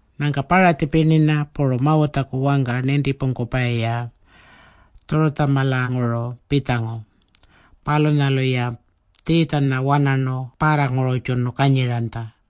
Nyangka Paratji pirninya puru Mawutjaku wangka nintipungkupayi-ya Tjurutjamalanguru pitjangu. Palunyalu-ya Tjiitjanya wanarnu parrangururrtjunu kanyiranytja.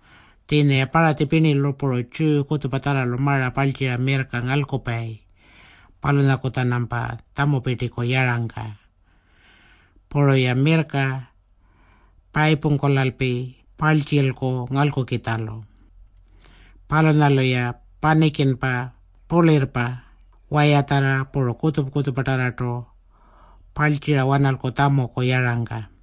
Tjiinya-ya Paratji pirnilu puru Tjiyu kutjupatjarralu mara parltjira mirrka ngalkupayi palunyaku-tjanampa tjamupirtiku yarangka. Puru-ya mirrka payipungkulalpi parltjilku ngalkukitjalu. Palunyalu-ya panikinpa, purlayirrpa, wayatjarra, puru kutjupa-kutjupatarrartu parltjira-wanalku tjamuku yarangka.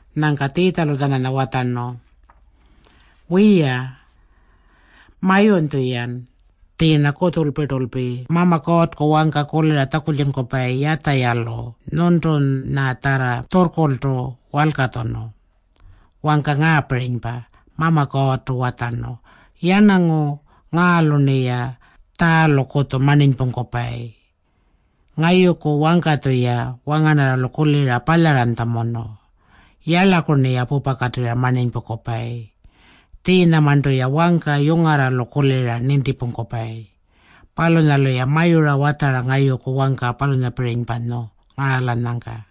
Nyangka Tjiitjalu-tjananya watjarnu, “Wiya, mayunytju-yan. Tjiinya kutjulpirtulpi Mama Kuurrku wangka kulira tjakultjunkupayi Yatjayalu nyuntunyatjarra tjurrkurltu walkatjunu. Wangka ngaapirinypa, Mama Kuurrtu watjarnu, ‘Yarnangu ngaalu-rniya tjaalukutju marninypungkupayi. Ngayuku wangka-tjuya wangarnarralu kulira palyaranytjamunu. Yarlaku-rniya pupakatirra marninypungkupayi. Tjiinyamarntu-ya wangka yungarralu kulira nintipungkupayi. Palunyalu-ya mayura watjara ngayuku wangka palunyapirinypanyu ngaralanyangka.’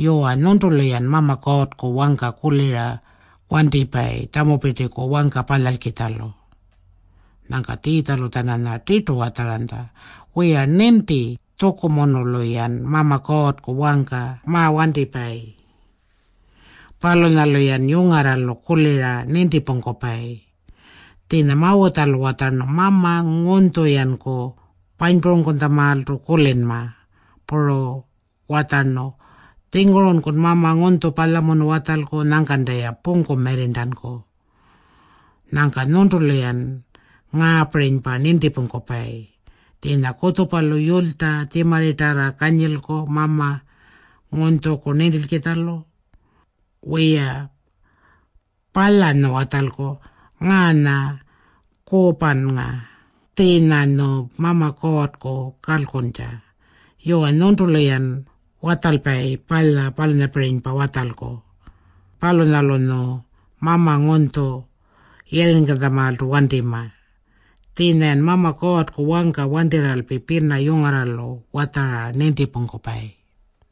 “Yuwa, nyuntulu-yan Mama Kuurrku wangka kulira wantipayi tjamupirtiku wangka palyalkitjalu.” Nyangka Tjiitjalu-tjananya tirtu watjaranytja, “Wiya, ninti tjukumunulu-yan Mama Kuurrku wangka mawantipayi. Palunyalu-yan yungarralu kulira nintipungkupayi. Tjiinya Mawutjalu watjarnu, ‘Mama ngunytju-yanku panypurangkutjamaaltu kulinma.’ Puru watjarnu, ‘Tjingurunkun mama ngunytju palyamunu watjalku. Nyangkanta-ya pungku mirrirntanku.’ Nyangka nyuntulu-yan ngaapirinypa nintipungkupayi. Tjiinya kutjupalu yulytja tjimarritarra kanyilku mama ngunytjuku nintilkitjalu. Wiya, palyanyu watjalku, ‘Ngaanya Kuupannga.’ Tjiinyanyu Mama Kuurrku kalkuntja. Yuwa, nyuntulu-yan watjalpayi palya palunyapirinypa watjalku. Palunyalunyu mama ngunytju yirringkankutjamaaltu wantima. Tjiinya-yan Mama Kuurrku wangka wantirralpi pina yungarralu watjara nintipungkupayi.”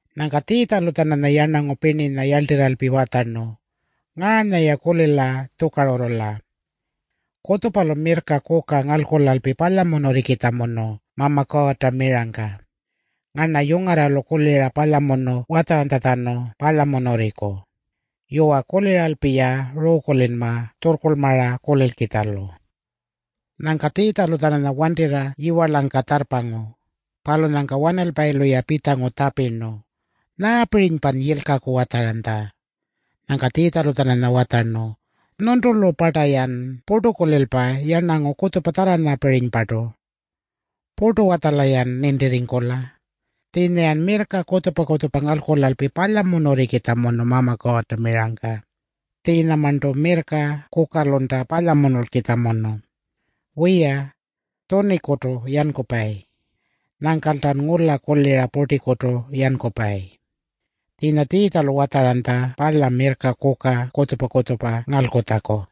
Nyangka Tjiitjalu-tjananya yarnangu pirninya yarltirralpi watjarnu, “Ngaanya-ya kulila tjukarurrula. Kutjupalu mirrka kuka ngalkulalpi palyamunurringkukitjamunu Mama Kuurrta mirangka. Ngarna yungarralu kulira palyamunu watjaranytjatjanu palyamunurringku. [Yuwa, kuliralpi-ya ruukulinma tjurrkurlmara kulilkitjalu.]” Nyangka Tjiitjalu-tjananya wantirra yiwarlangka tjarrpangu. Palunyangka wanalpayilu-ya pitjangu tjapirnu, “Nyaapirinypan yilkaku watjaranytja?” Nyangka Tjiitjalu-tjananya watjarnu, “Nyuntulu-parta-yan purtukulilpa yarnangu kutjupatjarrapirinypartu? Purtu-watjala-yan nintirringkula? Tjiinya-yan mirrka kutjupa-kutjupa ngalkulalpi palyamunurringkukitjamunu Mama Kuurrta mirangka. Tjiinyamarntu mirrka kukalunta palyamunulkitjamunu. Wiya, tjunikutu yankupayi. Nyangkaltan ngula kulira purtikutu yankupayi.” Tjiinya Tjiitjalu watjaranytja palya mirrka kuka kutjupa-kutjupa ngalkulatjaku.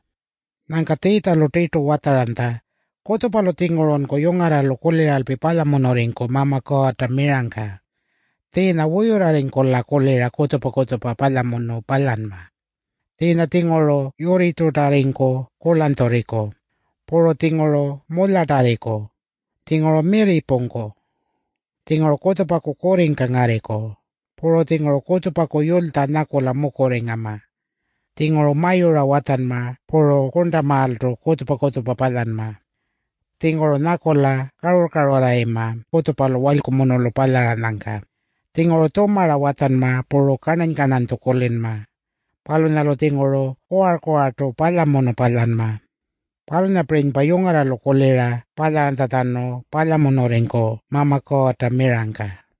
Nyangka Tjiitjalu tirtu watjaranytja, “Kutjupalu-tjingurunku yungarralu kuliralpi palyamunurringku Mama Kuurrta mirangka. Tjiinya wuyurrarringkula kulira kutjupa-kutjupa palyamunu palyanma. Tjiinya-tjinguru yurritjurtarringku kurlanytjurriku. Puru-tjinguru mulyatarriku. Tjinguru mirri pungku. Tjinguru kutjupaku kurringka ngarriku. Puru-tjinguru kutjupaku yulytja nyakula mukurringama. Tjinguru mayura watjanma puru kurntamaaltu kutjupa-kutjupa palyanma. Tjinguru nyakula karurr-karurrarringama kutjupalu walykumunulu palyaranyangka. Tjinguru tjumara watjanma puru karnany-karnanytju kulinma. Palunyalu-tjinguru kuwar-kuwartu palyamunu palyanma. Palunyapirinypa yungarralu kulira palyaranytjatjanu palyamunurringku Mama Kuurrta mirangka.”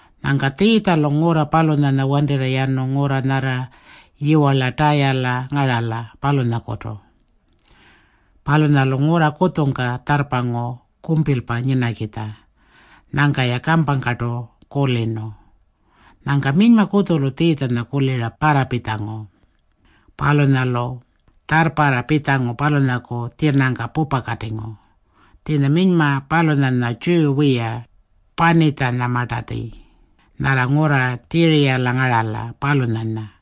Nyangka Tjiitjalu ngurra palunyanya wantirra yanu ngurra nyarra yiwarla Tayala ngarala, palunyalakutu. Palunyalu ngurra kutjungka tjarrpangu kumpilpa nyinakitja. Nyangka-ya kampangkartu kulirnu. Nyangka minyma kutjulu Tjiitjanya kulira parrapitjangu. Palunyalu tjarrparra pitjangu palunyaku tjinangka pupakatingu. Tjiinya minyma palunyanya Tjiyu wiya Panitjanyamartatji, nyarra ngurra Tjiriyala ngarala, palunyanya.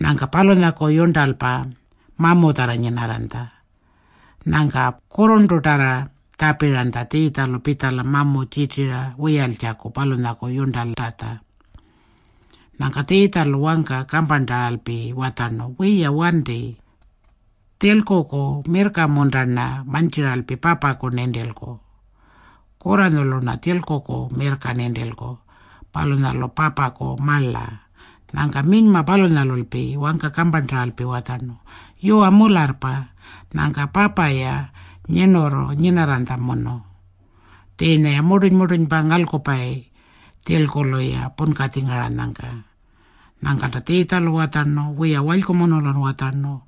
Nyangka palunyaku yurntalpa mamutjarra nyinarranytja. Nyangka kurrurntutarra tjapiranytja Tjiitjalu pitjala mamu tjirtira wiyaltjaku palunyaku yurntaltatja. Nyangka Tjiitjalu wangka kamparntaralpi watjarnu, “Wiya wanti. Tjilkuku mirrka-munta-rna mantjiralpi papaku nintilku? Kurranyulu-rna tjilkuku mirrka nintilku. Palunyalu papaku marla.” Nyangka minyma palunyalulpi wangka kamparntaralpi watjarnu, “Yuwa, mularrpa. Nyangka papa-ya nyirnurru nyinarranytjamunu. Tjiinya-ya murtuny-murtunypa ngalkupayi tjilkulu-ya punkatjingaranyangka.” Nyangkalta Tjiitjalu watjarnu, “Wiya, walykumunulun watjarnu.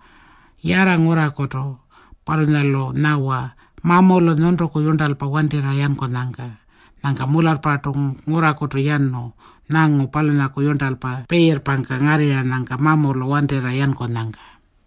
Yarra ngurrakutu. Palunyalu nyawa mamulu nyuntuku yurntalpa wantirra yankunyangka.” Nyangka mularrpartu ngurrakutu yanu nyangu palunyaku yurntalpa piirrpangka ngarrirranyangka mamulu wantirra yankunyangka.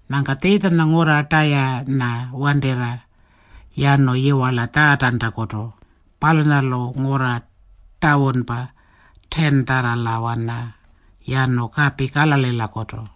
Nyangka Tjiitjanya ngurra Tayanya wantirra yanu yiwarla Tjaatantakutu. Palunyalu ngurra Tawunpa 10-tjarralawana yanu kapi Kalalilakutu.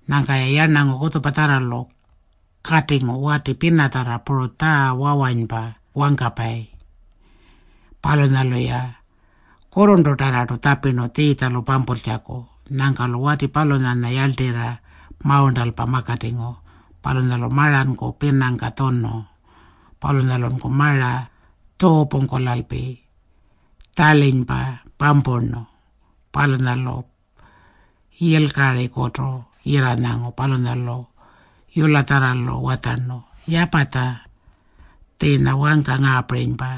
Nyangka-ya yarnangu kutjupatjarralu katingu wati pinatjarra puru tjaa wawanypa wangkapayi. Palunyalu-ya kurrurntutarrartu tjapirnu Tjiitjalu pampultjaku. Nyangka-lu wati palunyanya yarltirra mawurntalpa makatingu. Palunyalu maranku pinangka tjunu. Palunyalunku mara tjuupungkulalpi tjarlinypa pampurnu. Palunyalu yilkarikutu yirranyangu. Palunyalu yulatjarralu watjarnu, “Yapatja.” Tjiinya wangka ngaapirinypa,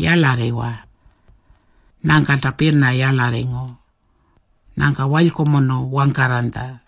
“Yarlarriwa”. Nyangkalta pina yarlarringu. Nyangka walykumunu wangkarranytja.